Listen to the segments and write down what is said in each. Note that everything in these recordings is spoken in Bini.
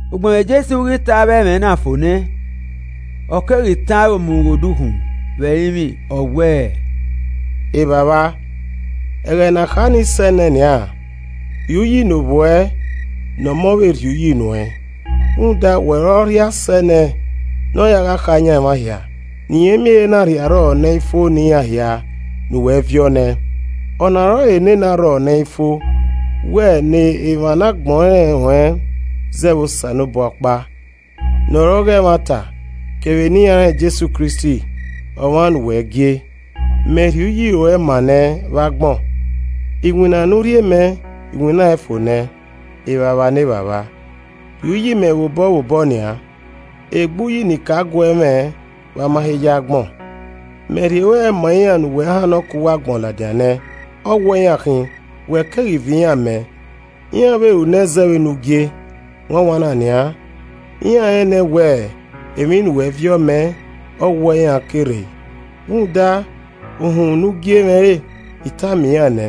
Ugbẹn vbe Jesu ghi ta avbe ẹmwẹ na fo nẹ, ọ keghi tọn aro mu ghe odukhunmwu, ọ wẹẹ, “Evbavba, ẹghẹ na kha nii sẹ nẹ nian. Rhie uyi ne Ovbi uẹ ne Ọmọ vbe rhie uyi nuẹn. Rhunmwuda, wẹ ọre ọ rhie asẹ nẹẹn ne ọ gha kha yan emwa hia, ne irẹn miẹn ehe ne rhie arrọọ ne ẹ i fo ne iran hia ne uwẹ viọ ne ẹn. Ọna ọrọre nene arrọọ ne ẹ i fo wẹ ne emwa ne agbọn rẹn ruẹn zẹ vbe Osanobua ọkpa ne ọ re ọghe ẹmwata kevbe ne iran rẹn Jesu Kristi, ọmwa ne uwẹ gie. Mẹ rhie uyi ruẹ maa nẹ vbe agbọn: Iwinna ne u rhie mẹ, I winnaẹn fo nẹ. Evbavba ne Evbavba, rhie uyi mẹ vbobọ vbobọ nian, egbe uyi ne I ka guẹ mwẹ vbe a ma he yi agbọn. “Mẹ rhie ruẹ ma iran ne uwẹ hannọ ke uwu agbọn ladian nẹ. Ọghuẹ iran khin, wẹ keghi viọ iran mẹ, iran vbe ru nẹ zẹ vbe ne u gie. Wanwanna nian, iran rẹn nẹ wẹ, emwi ne uwẹ viọ mẹ, ọghuẹ iran ke rre. Rhunmwuda uhunmwu ne u gie mwẹ re, I tama iran nẹ,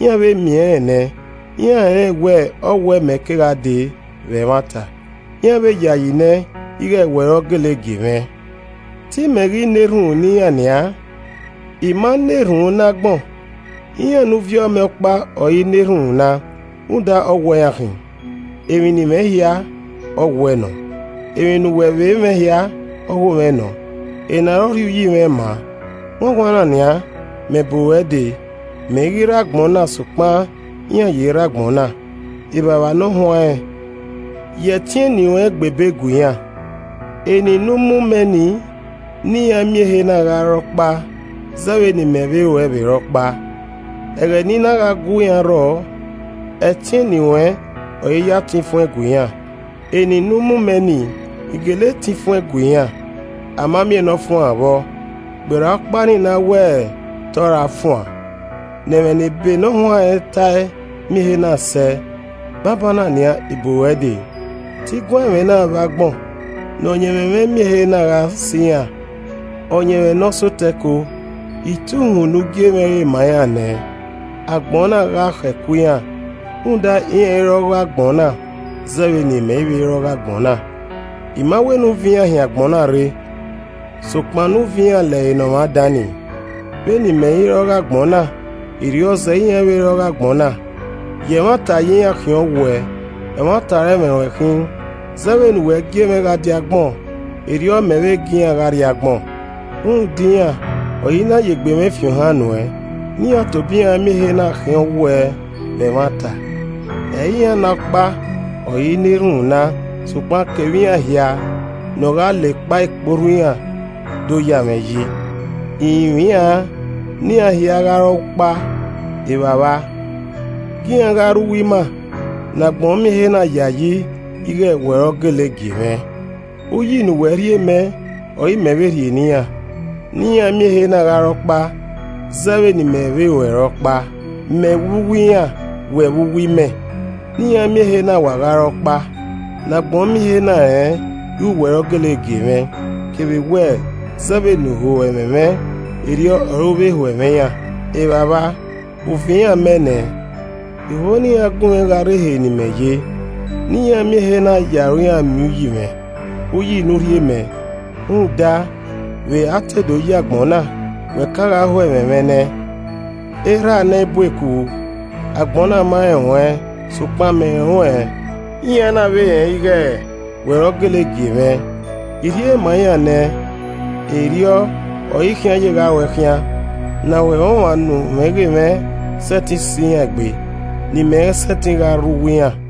iran vbe miẹn rẹn nẹ, iran rẹnrẹn wẹ ọghuẹ mẹ ke gha dee vbe ẹmwata, iran vbe yayi nẹ ighẹ wẹ ọre ọ gele gie mwẹ. “Te I mẹ ghi na erhunmwu ne iran nian, I ma na erhunmwu ne agbọn, iran ne u viọ mẹ ọkpa ọre I na erhunmwu na rhunmwuda ọghuẹ iran khin. Emwi ne I mwẹ hia, ọ wuẹ nọ, emwi ne uwẹ vbe mwẹ hia, ogho mwẹ nọ. Ena ọre ọ rhie uyi mwẹ maa. Wanwanna nian, mẹ bu ruẹ dee, mẹ i ghi rre agbọn na sokpan iran ye rre agbọn na, Evbavba Ne Ọ Huanrẹn ya ẹtin eni ruẹn gbe ebe gue iran, eni ne u mu mẹ nii, ne iran miẹn ehe na gha re ọkpa zẹ vbe ne ima vbe ruẹ vbe re ọkpa. Ẹghẹ ne I na gha gu iran rrọ, ẹtin eni ruẹn ọre I ya tan ifuẹn gue iran, eni ne u mu mẹ nii, I gele tan ifuẹn gue iran, a ma miẹn ne ọ fuan vbọ, gberra ọkpa nii ne a wẹ te ọ ra fuan, ne ẹmwẹ ne ebe ne ọ huanrẹn ta ẹe miẹn ehe na sẹ. Banbanna nian, I bu ruẹ dee. Te I guan ẹmwẹ na vbe agbọn, ne ọyẹnmwẹ mwẹ miẹn ehe na gha sẹ iran, ọyẹnmwẹ ne ọ sẹ otọ ẹko. I ta uhunmwu ne u gie mwẹ re ma iran nẹ, agbọn na gha khọ ẹko iran, rhunmwuda iran i re ọghe agbọn na zẹ vbe ne imẹ i vbe re ọghe agbọn na. I ma wẹ ne u viọ iran hin agbọn na rre, sokpan ne u viọ iran lẹre ne Ọmwa dan nii. Vbene imẹ i re ọghe agbọn na, erriọ zẹẹ iran i vbe re ọghe agbọn na. Ye ẹmwata ya iran khian ọ wuẹ, ẹmwata ọre ẹmwẹ ruẹn khin. Zẹ vbene uwẹ gie mwẹ gha die agbọn, erriọ mẹ vbe gie iran gha rrie agbọn. Rhunmwuda iran, ọre I na ya egbe mwẹ fi ohan nuẹn, ne iran tobọ iran miẹn ehe na vbe khian ọwuẹ vbe ẹmwata. “Ẹ i re iran na ọkpa ọre I na erhunmwu na, sokpan kevbe iran hia ne ọ gha la ekpa ikporhu iran do ya mwẹ yi. I rinmwian ne iran hia gha re ọkpa. Evbavba, gie iran gha rre uwu ima ne agbọn miẹn ehe na yayi ighẹ wẹ ọre ọ gele gie mwẹ. Uyi ne uwẹ rhie mẹ ọre imẹ vbe rhie ne iran, ne iran miẹn ehe na gha re ọkpa zẹ vbene imẹ vbe ruẹ re ọkpa. Mẹ vbe uwu iran, wẹ vbe uwu imẹ, ne iran miẹn ehe na wa gha re ọkpa, ne agbọn miẹn ehe na rẹn ighẹ wẹ ọre ọ gele gie mwẹ, kevbe wẹ zẹ vbene u ho ẹmwẹ mwẹ, erriọ ọre u vbe ho ẹmwẹ iran. “Evbavba, u viọ iran mẹ nẹ, I ho ne iran gun mwẹ gha rre ehe ne imẹ ye ne iran miẹn ehe na ya aro iran miẹn uyi mwẹ, uyi ne u rhie mẹ, rhunmwuda, vbe a te do yi agbọn na wẹ ka gha ho ẹmwẹ mwẹ nẹ. Erha ne ẹ i bu eku, agbọn na ma rẹn ruẹn, sokpan mẹ rẹn ruẹn, iran na vbe rẹn ighẹ, wẹ ọre ọ gele gie mwẹ. I rhie ma iran nẹ, erriọ ọre I khian ye gha ru ẹe khian, ne ahoẹmwọmwa ne u mwẹ ghe mwẹ sẹtin sẹ iran egbe, ne imẹ sẹtin gha rre uwu iran.”